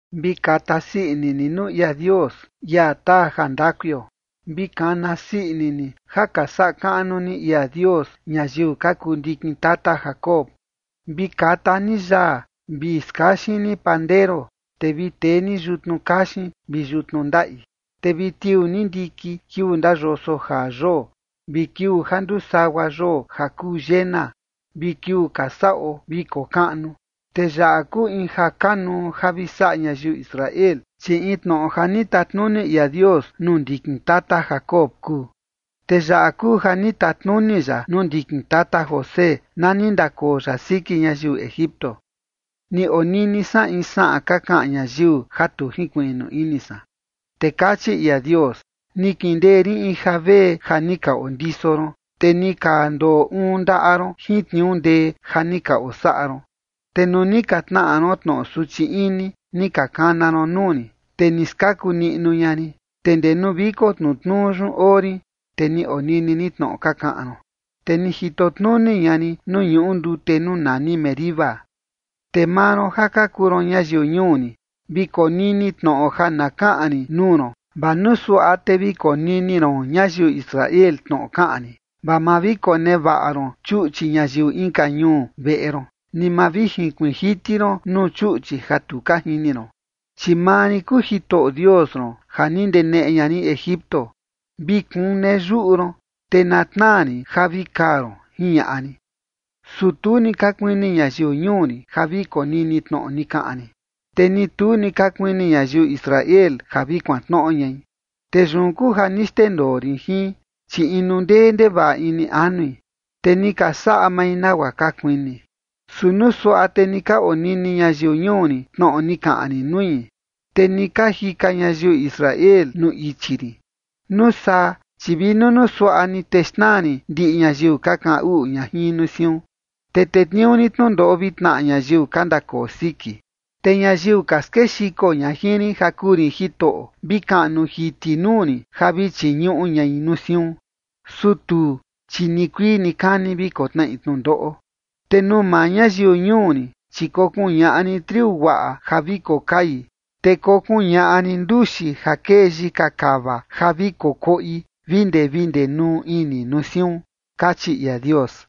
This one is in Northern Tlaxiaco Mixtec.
Vi kata sii ini ni nuu ia Dios, ia taa ja ndakuio. Vi kana sii ini ni ja ka saꞌa kaꞌnu ni ia Dios ñayiu ka kuu ndikin tata Jacob. Vi kata ni yaa vi skaxin ni pandero, te vi tee ni yutnu kaxin vi yutnu ndaꞌi. Te vi tiuu ni ndikin kiuu ndayoso jaa yoo, vi kiuu ja nduu sagua yoo ja kuu llena, vi kiuu ka saꞌo viko kaꞌnu. Te yaꞌa kuu in ja kanuu ja vi saꞌa ñayiu Israel, chi in tnoꞌo ja ni tatnuni ia Dios nuu ndikin tata Jacob kuu. Te yaꞌa kuu ja ni tatnuni ya nuu ndikin tata José, na ni ndakoo ya siki ñayiu Egipto. Ni onini san in saꞌan ka kaꞌan ñayiu ja tu jinkuiꞌnu ini san. Te kachi ia Dios: “Ni kindee rin in javee ja ni ka ondiso ron, te ni ka ndoo uun ndaꞌa ron jin tniuu ndee ja ni ka osaꞌa ron. Te nuu ni ka tnaꞌa ron tnoꞌo suchi ini, ni ka kana ron nuu rin, te ni skaku niꞌnu ña rin, te ndee nuu viko tnutnuu yun oo rin, te ni onini rin tnoꞌo ka kaꞌan ron, te ni jito tnuni ña rin nuu ñuꞌu ndute nuu nani Meriba. ’Te maa ron ja ka kuu ron ñayiu ñuu rin, vi konini tnoꞌo ja na kaꞌan rin nuu ron, vaa nuu suaꞌa te vi konini ron ñayiu Israel tnoꞌo kaꞌan rin. Vaa ma vi konevaꞌa ron chuꞌchi ñayiu inka ñuu veꞌe ron, ni ma vi junkuiin jiti ron nuu chuꞌchi ja tu ka jini ron. Chi maa rin kuu Jitoꞌo Dios ron ja ni ndeneꞌe ña rin Egipto. Vi kune yuꞌu ron, te na tnaa rin ja vi kaa ron, jiñaꞌa rin. ’Su tu ni ka kuini ñayiu ñuu rin ja vi konini tnoꞌo ni kaꞌan rin, te ni tu ni ka kuini ñayiu Israel ja vi kuantnoꞌo ñai. Te yun kuu ja ni xndendoo rin jin, chi inu ndee ndevaꞌa ini anui, te ni ka saꞌa mai nagua ka kuini. Su nuu suaꞌa te ni ka onini ñayiu ñuu rin tnoꞌo ni kaꞌan rin nui, te ni ka jika ñayiu Israel nuu ichi rin. Nuu saa, chi vi nunuu suaꞌa ni, te xnaa rin ndiꞌi ñayiu ka kaꞌan uꞌu ña jin nuu siun, te tetniuu rin tnundoꞌo vi tnaꞌa ñayiu ka ndakoo siki. Te ñayiu ka skexiko ña jin rin ja kuu rin Jitoꞌo, vi kaꞌnu jiti nuu rin ja vi chiñuꞌu ñai nuu siun. Su tuu, chi nikuii nikani vi kotnaꞌi tnundoꞌo. Te nuu maa ñayiu ñuu rin, chi kokuñaꞌa rin triu guaꞌa ja vi kokai, te kokuñaꞌa rin nduxi ja kee yika kava ja vi kokoꞌi vi ndee vi ndenuu ini nuu siun”, kachi ia Dios.